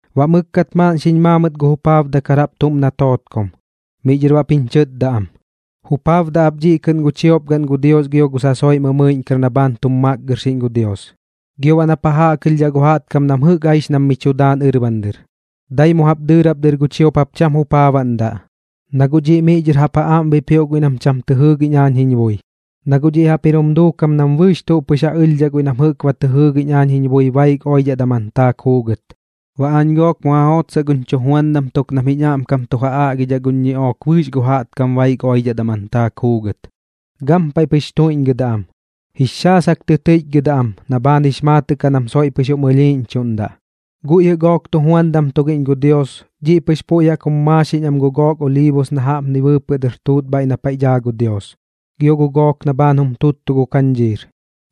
Baꞌ mɨkkat maaꞌn xiñ maa mɨt gu jupaabdakar jaꞌp tuꞌm na tootkom, miꞌ dhɨr baꞌp jiñ chɨtda am: ―Jupaabdaꞌ ap dhiꞌ kɨꞌn gu chiopgaꞌn gu Dios gio gu sasoiꞌ mɨmɨiꞌñkar na bhaan tum makgɨrxiꞌñ gu Dios, gio baꞌ nap ja jaꞌkɨlhdhaꞌ gu jaꞌtkam nam jɨꞌk aix nam mi chu daan ɨrban dɨr. Dai mu jaꞌp dɨɨrap dɨr gu chiop jap cham jupaabaꞌndaꞌ, na guꞌ dhiꞌ miꞌ dhɨr jaꞌp ja aꞌm bipioꞌ guiꞌ nam cham tɨ jɨɨgiꞌñ aañ jiñ bui. Na guꞌ dhiꞌ jaꞌp jir jum duukam nam bɨɨx tuꞌ pɨx ja ɨlhdhaꞌ guiꞌ nam jɨꞌk ba tɨ jɨɨgiꞌñdhaꞌ aañ jiñ bui baik oidhaꞌ daman taak juugɨt. Baꞌ aañ gook mu ja jootsaꞌ guñ chujuandam tuk nam jiñ aꞌmkam tu ja aꞌgidhaꞌ guñ ñiꞌook bɨɨx gu jaꞌtkam baik oidhaꞌ daman taak juugɨt. Gampaiꞌ pɨx tuiꞌñgɨdaꞌ am, jix xaasak tɨ tɨiꞌchgɨdaꞌ am na bhaan jix maatɨꞌ kaꞌ nam soiꞌ pɨx jum ɨlhiiꞌñchuꞌndaꞌ. Guiꞌ jɨꞌ gook tujuandam tugiꞌñ gu Dios, dhiꞌ pɨx puiꞌ jaꞌk jum maaxiꞌñ am gu gook oliibos na jaꞌpni bɨɨpɨꞌ dɨr tuꞌt bhaiꞌ na paiꞌ daa gu Dios, gio gu gook na bhaan jum tuttu gu kañdhiir.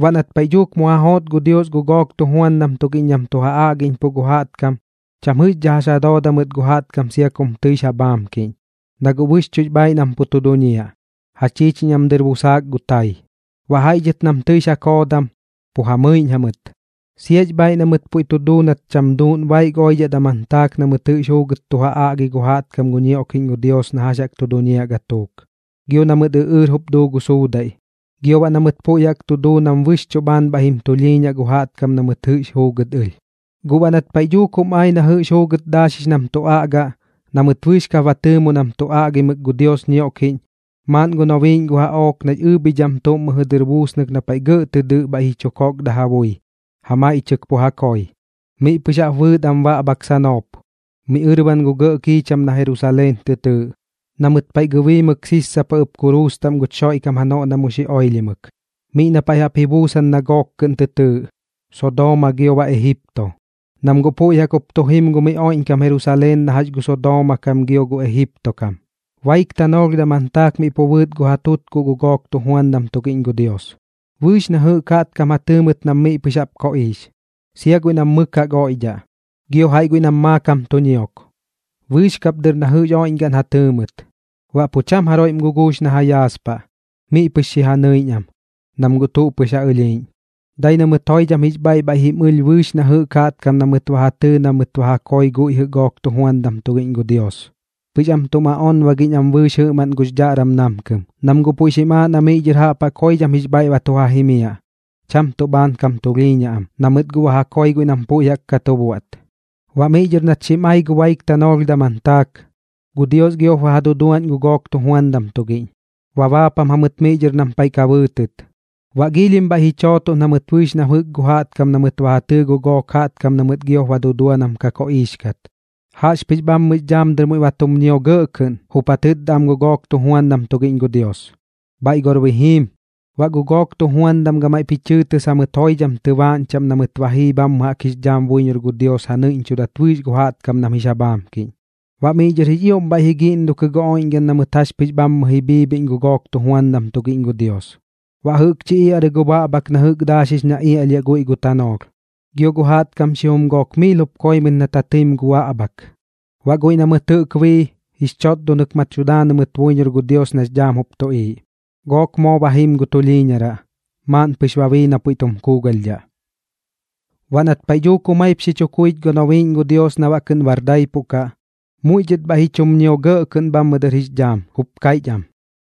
Baꞌ nat paiꞌ dhuuk mu ja joot gu Dios gu gook tujuandam tugiꞌñ nam tu ja aꞌgiꞌñpuꞌ gu jaꞌtkam, cham jɨꞌxdhaꞌ jax ja dooda mɨt gu jaꞌtkam sia kum tɨix ja bhaamkiꞌñ, na guꞌ bɨxchuꞌx bhaiꞌ nam pu tu duñiaꞌ, ja chiichiñ am dɨr busaak gu tai. Baꞌ jaiꞌ dhɨt nam tɨix ja koodam, pu ja mɨiꞌñ jamɨt. Siax bhaiꞌ na mɨt puiꞌ tu duu nat cham duuꞌn baik oidhaꞌ daman taak na mɨt jɨꞌx juugɨt tu ja aꞌgi gu jaꞌtkam gu ñioꞌkiꞌñ gu Dios na jax jaꞌk tu duñiaꞌ gatuuk, gio na mɨt ɨꞌɨɨr jup duu gu suudaiꞌ, gio baꞌ na mɨt puiꞌ jaꞌk tu duu nam bɨxchuꞌ bhaan bhaiꞌ jim tulhiiñaꞌ gu jaꞌtkam na mɨt jɨꞌx juugɨt ɨlh. Guꞌ baꞌ nat paiꞌ dhuuk jum ai na jɨꞌx juugɨt daaxix nam tu aꞌgaꞌ, na mɨt bɨɨx kap ba tɨɨmo nam tu aꞌgimɨk gu Dios ñioꞌkiꞌñ, maaꞌn gu nobiiꞌñ gu jaꞌook nax ɨɨbhidham tuꞌm mɨjɨ dɨr buusnɨk na paiꞌ gɇꞌ tɨ dɨꞌ bhaiꞌ ji chu kokda ja bui, ja maiꞌchɨk pu ja koi. Miꞌ pɨx jaꞌp bɨɨt am baꞌbhak sanoop, miꞌ ɨrban gu gɇꞌ kiicham na Jerusaleen tɨ tɨɨꞌ, na mɨt paiꞌ gɨbiimɨk sissapa ɨp kuruus taꞌm guch Xoiꞌkam janoꞌ na mu xi oilhimɨk, miꞌ na paiꞌ jaꞌp ji buusan na gook kɨꞌn tɨ tɨɨꞌ: Sodooma gio baꞌ Ejipto, nam guꞌ puiꞌ jaꞌk jup tu jim gu miꞌ oiꞌñkam Jerusaleen na jax gu Sodooma kam gio gu Ejipto kam. Baik tanoolh daman taak miꞌ pu bɨɨt gu ja tutkuꞌ gu gook tujuandam tugiꞌñ gu Dios. Bɨɨx na jɨꞌk jaꞌtkam ja tɨɨ mɨt nam miꞌ pɨx jaꞌp koꞌiix, sia guiꞌ nam mɨk jaꞌk oiꞌdhaꞌ, gio jaiꞌ guiꞌ nam maakam tu ñiok. Bɨɨx kap dɨr na jɨꞌx oiꞌñgaꞌn ja tɨɨ mɨt, baꞌ pu cham jaroiꞌm guguux na ja yaaspaꞌ, miꞌ pɨx xi ja nɨiꞌñ am, nam guꞌ tuꞌ pɨx ja ɨlhiiꞌñ. Dai na mɨt joidham jix bhaiꞌ bhaiꞌ jim ɨlh bɨɨx na jɨꞌk jaꞌtkam na mɨt ba ja tɨɨ na mɨt ba koi guiꞌ jɨꞌ gook tujuandam tugiꞌñ gu Dios, pɨx am tum aꞌonbagiꞌñ am bɨɨx jɨꞌmaꞌn gux dhaꞌram namkɨm, nam guꞌ puiꞌ xim aaꞌ na miꞌ dhɨr jaꞌp jaꞌk joidham jix bhaiꞌ ba tu ja jimiaꞌ, cham tuꞌ bhaan kam tulhiiñaꞌ am, na mɨt guꞌ ba koi guiꞌ nam puiꞌ jaꞌk ka tu buaꞌt. Baꞌ miꞌ dhɨr nat xim ai gu baik tanoolh daman taak, gu Dios giop ba ja duduaꞌñ gu gook tujuandam tugiꞌñ, ba baapam jamɨt miꞌ dhɨr nam paiꞌ ka bɨɨtɨt. Baꞌ giilhim bhaiꞌ ji chootoꞌn jamɨt bɨɨx na jɨꞌk jaꞌtkam na mɨt ba ja tɨɨ gu gook jaꞌtkam na mɨt giop ba dudua nam ka koꞌiix kat. Jaꞌxpɨx bhammɨx dhaam dɨr muiꞌ ba tum ñio gɇꞌ kɨꞌn, jup ja tɨtda am gu gook tujuandam tugiꞌñ gu Dios: ―Bhaiꞌ gor bi jiim. Baꞌ gu gook tujuandam gamaiꞌp ji chɨɨtɨs jamɨt joidham tɨbaaꞌñ chaꞌm na mɨt ba jii bhammɨ jaꞌk jix dhaam buiñor gu Dios ja nɨiꞌñchudat bɨɨx gu jaꞌtkam nam jix ja bhaamkiꞌñ. Baꞌ miꞌ dhɨr jix ioꞌm bhaiꞌ ji giꞌndokɨ gu oiꞌñgaꞌn na mɨt jax pɨx bhammɨ ji bhiibhiꞌñ gu gook tujuandam tugiꞌñ gu Dios, baꞌ jɨꞌkchi iaꞌrɨ gu baꞌbhak na jɨꞌk daaxix na iaꞌlhiaꞌ guiꞌ gu tanoolh, gio gu jaꞌtkam xijum gook miil jup koi mɨt nat ja tɨim gu baꞌbhak. Baꞌ guiꞌ na mɨt jɨꞌk bii, jix chotdonɨk ma tu daanɨ mɨt buiñor gu Dios nax dhaam jup tuꞌiiꞌ. Gook moo ba jim gu tulhiiñaraꞌ, maaꞌn pɨx ba bii na puiꞌ tum kuugalhdhaꞌ. Baꞌ nat paiꞌ dhuuk jumaip xi chu kuich gu nobiiꞌñ gu Dios nam baꞌ kɨꞌn bar daipuꞌ kaꞌ, muiꞌ dhɨt bhaiꞌ ji chum ñio gɇꞌ kɨꞌn bhammɨ dɨr jix dhaam, jup kaiꞌch am: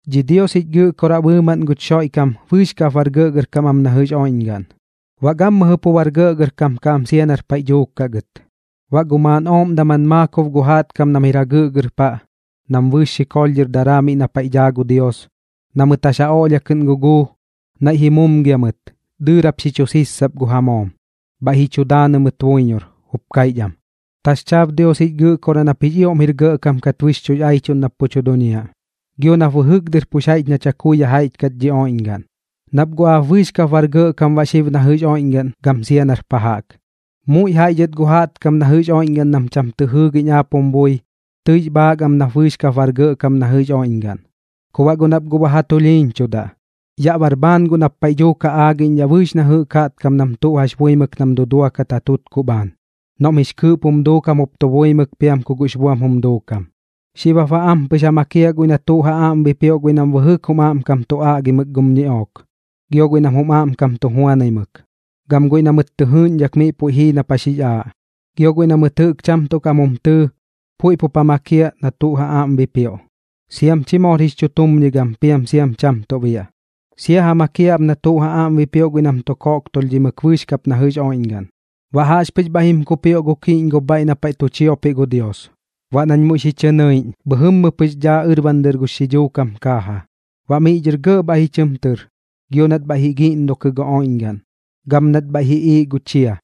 Dhi Dios jich Gɨꞌkoraꞌ bɨɨmaꞌn guch Xoiꞌkam, bɨɨx kap bar gɇꞌgɇrkam am na jɨꞌx oiꞌñgaꞌn, baꞌ gammɨjɨ pu bar gɇꞌgɇrkam kaꞌ am sia nar paiꞌ dhuuk kaꞌ gɨt. Baꞌ gu maaꞌn ooꞌm daman maakob gu jaꞌtkam nam jir jagɨꞌgɨr paꞌ, nam bɨɨx xikoolh dhɨr daraa miꞌ na paiꞌ daa gu Dios, na mɨt jax ja oꞌlhia kɨꞌn guguu, naiꞌ ji mumgia mɨt, dɨɨrap xi chu sissap gu ja moom, bhaiꞌ ji chu daanɨ mɨt buiñor, jup kaiꞌch am: Taxchaab Dios jich Gɨꞌkoraꞌ nap jix ioꞌm jir gɇꞌkam kat bɨxchuꞌx aichuꞌn nap pu tu duñiaꞌ, gio nap bɨjɨk dɨr pux jaiꞌch na chakui jaiꞌch kat dhi oiꞌñgaꞌn, nap guꞌ aap bɨɨx kap bar gɇꞌkam baꞌ xib na jɨꞌx oiꞌñgaꞌn gam sia nar pa jaꞌk. Muiꞌ jaiꞌ dhɨt gu jaꞌtkam na jɨꞌx oiꞌñgaꞌn nam cham tɨ jɨɨgiꞌñ aap jum bui, tɨix bhaak am nap bɨɨx kap bar gɇꞌkam na jɨꞌx oiꞌñgaꞌn. Ku baꞌ guꞌ nap guꞌ ba ja tulhiiñchudaꞌ, yaꞌ bar bhaan guꞌ nap paiꞌ dhuuk ja aagiꞌñdhaꞌ bɨɨx na jɨꞌk jaꞌtkam nam tuꞌ jax buimɨk nam duduakat ja tutkuꞌ bhaan, noꞌm jix kɨɨꞌp jum duukam jup tu buimɨk piam ku guꞌx buam jum duukam. Xib jap baꞌ ampɨx tu ja makiaꞌ guiꞌ na tuꞌ ja aꞌm bipioꞌ guiꞌ nam bɨjɨk jum aꞌmkam tu aꞌgimɨk gum ñiꞌook, gio guiꞌ nam jum aꞌmkam tu juanaimɨk, gam guiꞌ na mɨt tɨ jɨɨꞌñdhak miꞌ puiꞌ jii nap jax jix aaꞌ. Gio guiꞌ na mɨt jɨꞌk cham tuꞌ kaꞌm jum tɨɨ, puiꞌp jup ja makiaꞌ na tuꞌ ja aꞌm jup bipioꞌ, siam chi moor jix chutumñigam piam siam cham tuꞌ biaꞌ. Sia ja makiaꞌ ap na tuꞌ ja aꞌm bipioꞌ guiꞌ nam tu koꞌktulhdhimɨk bɨɨx kap na jɨꞌx oiꞌñgaꞌn. Baꞌ jaꞌxpɨx bhaiꞌ jim kupioꞌ gu kiꞌñgob bhaiꞌ na paiꞌ tu chiopiꞌ gu Dios. Baꞌ nañ muiꞌ xi chɨ nɨiꞌñ, bhɨjɨmmɨ pɨx daa ɨrban dɨr gux xidhuu kam kaaja. Baꞌ miꞌ dhɨr gɇꞌ bhaiꞌ ji chɨm tɨr, gio nat bhaiꞌ ji giꞌndokɨ gu oiꞌñgaꞌn, gam nat bhaiꞌ ji iiꞌ gu chia.